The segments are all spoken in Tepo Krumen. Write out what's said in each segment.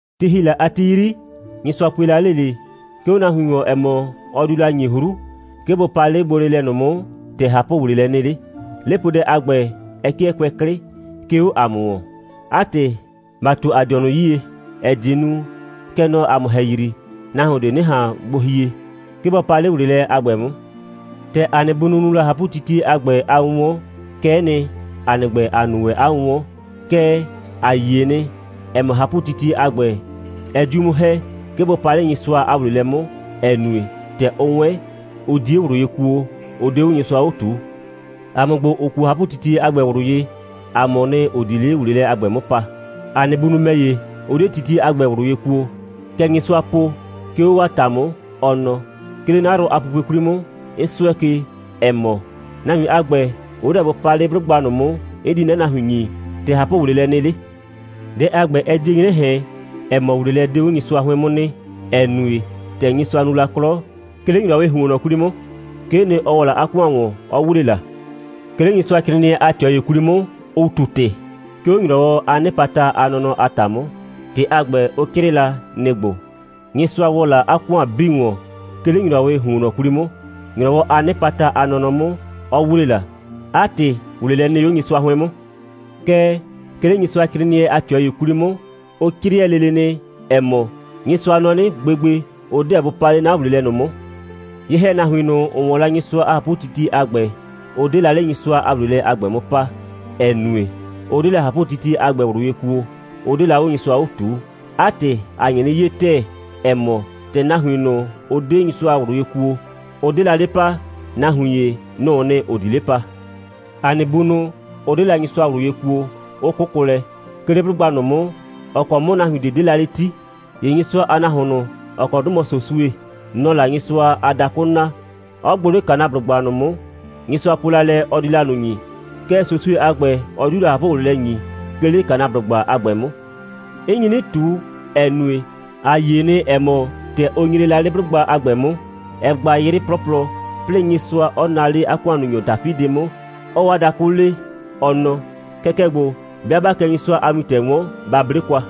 Ti ‑hi la a ti 'yri, Nyɩsʋa pue la 'le ꞊le, 'ke 'o 'a nahuin ‑wɔn, ‑ɛ mɔ, ɔ diu la ‑nyi 'hru, 'ke bʋ pa 'le 'a gbonɩɩlɛ ꞊nʋ 'mʋ, ‑tɛ ꞊hapʋ‑wleelɛ nɩ 'le. 'Lepoodɛ a ‑gbɛ, ɛ 'kɩɛ kʋɛ 'klɩ, 'ke 'o ‑a mʋ ‑wɔn. 'A ‑tɩ, ‑ba ꞊tu ‑a dɩɔnʋ 'yie, ‑ɛ die nu, kɛ nɔ ‑a mʋ ‑hɛyri, nahuon ꞊de 'nɩ ꞊han gbo hie, 'ke bɔ pa 'le ‑wleelɛ a ‑gbɛ 'mʋ. ‑Tɛ ‑a nɩ bunʋ nu la ꞊hapʋtitie a ‑gbɛ a 'wʋnwɔn, kɛ'ɛ nɩ, ‑a nɩ ‑gbɛ, ‑a nu ‑wɛ 'a 'wʋnwɔn. Kɛɛ, ‑a yie nɩ, ‑ɛ mɔ, ꞊hapʋtitie a ‑gbɛ, ɛ 'diu 'mʋ ‑hɛ, 'ke bʋ pa 'le Nyɩsʋa a ‑wleelɛ 'mʋ, ‑ɛ nue, ‑tɛ ʋ 'wɛn, ʋ 'die ꞊wlʋ ye kuo, 'ʋ 'de 'o Nyɩsʋa 'o ꞊tuu. ‑A mʋ ‑gbo, ‑ʋ kuo ꞊hapʋtitie a ‑gbɛ ꞊wlʋ ye, ‑a mʋʋ nɩ, ‑ʋ di 'le ‑wleelɛ a ‑gbɛ 'mʋ pa. ‑A nɩ bunʋ ‑mɛ ‑ye, ‑ʋ 'de titie a ‑gbɛ ꞊wlʋ ye kuo, kɛ Nyɩsʋaa po, 'ke 'o 'waa ‑ta 'mʋ, ɔ nɔ: «'Ke 'le 'na yrʋ a pupue 'kwli 'mʋ, 'n 'sʋɛ ke, ‑ɛ mɔ, nahuin a ‑gbɛ, ʋ 'deɛ bʋ pa 'le 'blʋgba ꞊nʋ 'mʋ, 'n di 'na nahuin ‑nyi, ‑tɛ ꞊hapʋ‑wleelɛ nɩ 'le.» Dɛ a ‑gbɛ, ɛ 'die 'nyrɛ ꞊hɛn, ‑ɛ mɔ, ‑wleelɛ 'de 'o Nyɩsʋa 'hʋɩn 'mʋ nɩ, ‑ɛ nue, ‑tɛ Nyɩsʋa nu la 'klɔ, 'ke 'le ‑nyrɔwɩɩ ‑huonnɔ 'kwli 'mʋ, 'kee nɩ, ɔ ‑wɔ la 'a ‑kʋan ‑wɔn, 'ɔ ‑wle la. 'Ke 'le Nyɩsʋacrɩɩnɩɛ a ꞊tɩɔ ‑ye 'kwli 'mʋ, ʋ ꞊tu ‑tɩ, 'ke 'o ‑nyrɔwɔ a 'nɩpata a nɔnɔ a ‑ta 'mʋ. ‑Tɩ a ‑gbɛ, ʋ 'crɩɩ la, nɩ‑ ‑gbo: «Nyɩsʋa ‑wɔ la 'a ‑kʋan 'bii ‑wɔn, 'ke 'le ‑nyrɔwɩɩ ‑huonnɔ 'kwli 'mʋ, ‑nyrɔwɔ a 'nɩpata a nɔnɔ 'mʋ, 'ɔ ‑wle la.» ('A ‑tɩ ‑wleelɛ nɩ 'o Nyɩsʋa 'hʋɩn 'mʋ.) Kɛɛ, 'ke 'le Nyɩsʋacrɩɩnɩɛ a ꞊tɩɔ ‑ye 'kwli 'mʋ, ʋ 'crɩɛ lele nɩ, ‑ɛ mɔ: «Nyɩsʋa nɔ 'nɩ: Gbegbe, ʋ 'deɛ bʋ pa 'le 'na ‑wleelɛ ꞊nʋ 'mʋ.» Ye‑hɛnahuin ꞊nʋ, ‑ʋ 'wɔn la Nyɩsʋa a ꞊hapʋtitie a ‑gbɛ, ʋ 'de la 'le Nyɩsʋa a ‑wleelɛ a ‑gbɛ 'mʋ pa, ‑ɛ nue, ʋ 'de la ꞊hapʋtitie a ‑gbɛ ꞊wlʋ ye kuo, 'ʋ 'de la 'o Nyɩsʋa 'o ꞊tuu. 'A ‑tɩ, ‑a nye 'nɩ 'ye ‑tɛɛ, ‑ɛ mɔ, ‑tɛ nahuin ꞊nʋ, ‑ʋ 'de Nyɩsʋa ꞊wlʋ ye kuo, ʋ 'de la 'le pa, nahuin ‑ye, nʋ‑ʋ nɩ, ‑ʋ di 'le pa. ‑A nɩ bunʋ ꞊nʋ, ‑ʋ 'de la Nyɩsʋa ꞊wlʋ ye kuo, ʋ 'kʋkʋ lɛ, 'ke 'le 'blʋgba ꞊nʋ 'mʋ, ‑ɔ kɔ 'mʋ nahuin ꞊de 'de la 'le 'ti. ‑Ye Nyɩsʋa a nahuon ꞊nʋ, ‑ɔ kɔ 'dʋ mɔ Sosue, nɔ‑ɔ la Nyɩsʋa a dakʋ naa, 'ɔ gbʋ 'le Kanaablʋgba ꞊nʋ 'mʋ, Nyɩsʋa po la lɛ, ɔ di la ꞊nʋ ‑nyi. Kɛɛ, Sosue a ‑gbɛ, ɔ 'diu la ꞊hapʋ‑wleelɛ ‑nyi, 'ke 'le Kanaablʋgba a ‑gbɛ 'mʋ. 'N nyi 'nɩ ꞊tu, ‑ɛ nue, ‑a yie nɩ, ‑ɛ mɔ, ‑tɛ ʋ nyre la 'le 'blʋgba a ‑gbɛ 'mʋ, ɛ gba 'yrɩ 'plɔplɔ, 'plɩɩ Nyɩsʋa 'ɔ naa 'le 'a ‑kʋannunyɔ Dafidɩ 'mʋ, 'ɔɔ 'a dakʋ le, ɔ nɔ: «Kɛkɛ ‑gbo, 'bɩa 'baa kɛ Nyɩsʋa a wintɛ 'wɔn, ba 'ble kwa.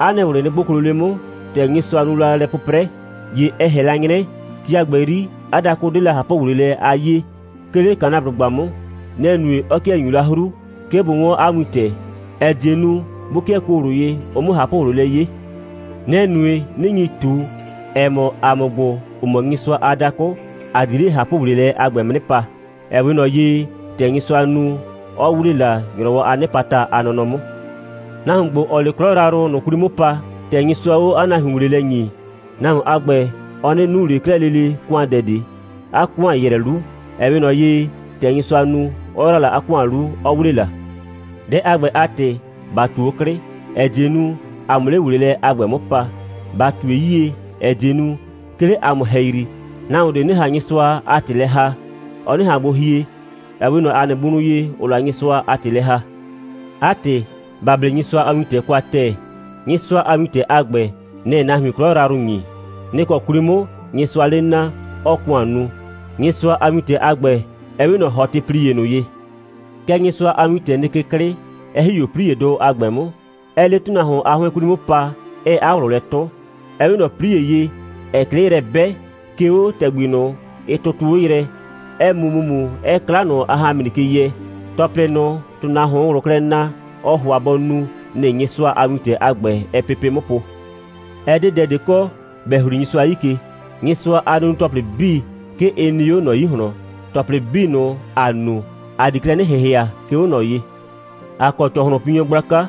'A nɩ ꞊wlɩ nɩ 'gboklo 'le 'mʋ.» ‑Tɛ Nyɩsʋa nu la lɛ 'pʋprɛ, ‑ye ɛ ꞊hɛn la 'nyrɛ, ti a ‑gbɛ 'yri, 'a dakʋ 'de la ꞊hapʋ‑wleelɛ a 'yee, 'ke 'le Kanaablʋgba 'mʋ. Nɛ‑ nue, 'ɔ 'kɩɛ ‑nyuu la 'hru, 'ke bʋ 'wɔn 'a wintɛ, ‑ɛ die nu, 'bʋ 'kɩɛ kuo ꞊wlʋ ye, ʋ 'mʋ ꞊hapʋ‑wleelɛ 'ye. Nɛ‑ nue, 'nɩ nyi ꞊tu, ‑ɛ mɔ, ‑a mʋ ‑gbo, ‑ʋ mɔ Nyɩsʋa a dakʋ, ‑a di 'le ꞊hapʋ‑wleelɛ a ‑gbɛ 'mʋ 'nɩ pa, ‑ɛ 'we ꞊nɔ ye, ‑tɛ Nyɩsʋa nu, 'ɔ ‑wle la, ‑nyrɔwɔ a 'nɩpata a nɔnɔ 'mʋ. Nahuon ‑gbo, ‑ɔɔ 'le 'klɔ yrayrʋ ꞊nʋ 'kwli 'mʋ pa, ‑tɛ Nyɩsʋaa 'o 'a nahuin ‑wleelɛ ‑nyi, nahuon a ‑gbɛ, ɔ 'nɩ nu ꞊le 'klɛɛ lele ‑kʋandɛ ꞊de. 'A ‑kʋan ‑yrɛ 'lu, ‑ɛ 'we ꞊nɔ ye, ‑tɛ Nyɩsʋa nu, 'ɔ ‑yra la 'a ‑kʋan 'lu, 'ɔ ‑wle la. Dɛ a ‑gbɛ a ‑tɩ, ‑ba ꞊tu 'o 'klɩ, ‑ɛ die nu, ‑a 'mʋ 'le ‑wleelɛ a ‑gbɛ 'mʋ pa. ‑Ba ꞊tue 'yie, ‑ɛ die nu, 'ke 'le ‑a mʋ ‑hɛyri, nahuon ꞊de 'nɩ ꞊han Nyɩsʋa a ‑tɩ lɛ ‑haa, ɔ 'nɩ ꞊han gbo hie, ‑ɛ 'we ꞊nɔ ‑a nɩ bunʋ ye, ‑ʋʋ la Nyɩsʋa a ‑tɩ lɛ ‑haa. 'A ‑tɩ, ‑ba 'ble Nyɩsʋa a wintɛ kwa ‑tɛɛ. Nyɩsʋa a wintɛ a ‑gbɛ, nɛ‑ɛ nahuin 'klɔ yrayrʋ ‑nyi. Nɩ‑ kɔ 'kwli 'mʋ Nyɩsʋaa 'le naa, 'ɔɔ ‑kʋan nu. Nyɩsʋa a wintɛ a ‑gbɛ, ɛ 'we ꞊nɔ ‑hɔtɩplie ꞊nʋ ye. Kɛɛ, Nyɩsʋa a wintɛ nɩ ke 'klɩ, 'ɛ ‑hi 'o 'pliedʋ a ‑gbɛ 'mʋ, 'ɛɛ 'le ‑tʋnahuon a 'hʋɩn 'kwli 'mʋ pa, 'ɛɛ 'a ꞊wlʋ lɛ 'tʋ. Ɛ 'we ꞊nɔ 'plie ye, ‑ɛɛ 'klɩ yrɛ 'bɛ, 'ke 'o ‑tɛgbi ꞊nʋ, ɩ tʋtʋʋ 'o yrɛ, 'ɛɛ mu ‑mumu, 'ɛɛ 'kla ꞊nʋ a ꞊hanmri ke yɛ. ‑Tɔplɩ ꞊nʋ, ‑tʋnahuoon ꞊wlʋ klɛ naa, ɔɔ ‑hʋa bɔ nu, nɩ‑ Nyɩsʋa a wintɛ a ‑gbɛ, ɛɛ pepe' 'mʋ po. Ɛ 'de dɛ ꞊de kɔ, ‑bɛ ‑hli Nyɩsʋa 'yi ke. Nyɩsʋa a nunu‑tɔplɩ 'bii, 'ke ɩ nɩ 'o ꞊nɔ 'yi ꞊hlɔn. ‑Tɔplɩ 'bii ꞊nʋ, ‑a nu, ‑a di klɛ 'nɩ ‑hɩhɩa, 'ke 'o ꞊nɔ ye. ‑A kɔ ‑cɔhlʋnpinyɔ gblaka.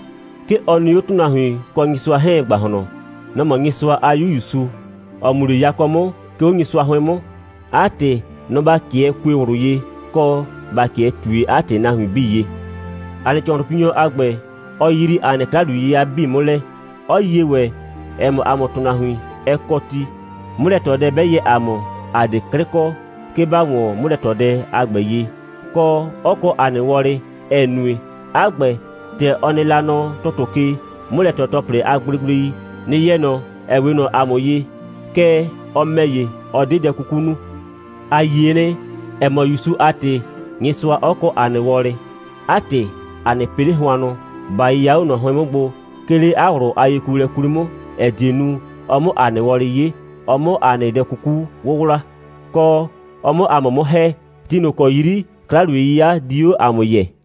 'Ke ɔ nɩ 'o ‑tʋnahuin kɔ Nyɩsʋa 'hɛɛn a ‑gbahlɔn. Nɔ‑ mɔ Nyɩsʋa a 'Yu ‑Yusu, ‑ɔ mu 'le yakɔ 'mʋ, 'ke 'o Nyɩsʋa 'hʋɩn 'mʋ. 'A ‑tɩ, nɔ‑ ‑ba 'kɩɛ kue ꞊wlʋ ye, kɔ, ‑ba 'kɩɛ ꞊tue 'a ‑tɩ nahuin 'bii ye. ‑A nɩ ‑cɔhlʋnpinyɔ a ‑gbɛ, ɔ yrii ‑a nɩ 'kla‑wliye'yɩya 'bii 'mʋ lɛ, 'ɔ yie ‑wɛ, ‑ɛ mɔ, ‑a mʋ ‑tʋnahuin, ɛ kɔ ti, 'mʋlɛ꞊tɔdɛ 'bɛ yɛ ‑a mʋ, ꞊a 'de 'klɩ kɔ, 'ke ‑ba ‑wɔn 'mʋlɛ꞊tɔdɛ a ‑gbɛ ye, kɔ, 'ɔ kɔ ‑a nɩ wɔlɩ, ‑ɛ nue, 'a ‑gbɛ, ‑tɛ ɔ nɩ la nɔ ‑tʋtʋ ke, 'mʋlɛ꞊tɔ‑tɔplɩ a gblegblei, nɩ‑ yɛ ꞊nɔ, ‑ɛ 'we ꞊nɔ ‑a mʋ ye. Kɛɛ, ɔ ‑mɛ ‑ye, ɔ 'de dɛ 'kuku nu. ‑A yie nɩ, ‑ɛ mɔ, ‑Yusu a ‑tɩ, Nyɩsʋa 'ɔ kɔ ‑a nɩ wɔlɩ. 'A ‑tɩ, ‑a 'nɩ pɩ 'le hʋannʋ, ‑ba 'yɩya 'o ꞊nɔ 'hʋɩn 'mʋ gbo, 'ke 'le 'a ꞊wlʋ a yekuolɛ 'kwli 'mʋ, ‑ɛ die nu, ɔ 'mʋ ‑a nɩ wɔlɩ 'ye, ɔ 'mʋ ‑a nɩ dɛ 'kuku 'wʋwla, kɔ, ɔ 'mʋ ‑a mʋ 'mʋ ‑hɛ, ti ꞊nʋ ‑kɔ 'yri 'kla‑wliye'yɩya di 'o ‑a mʋ yɛɛ.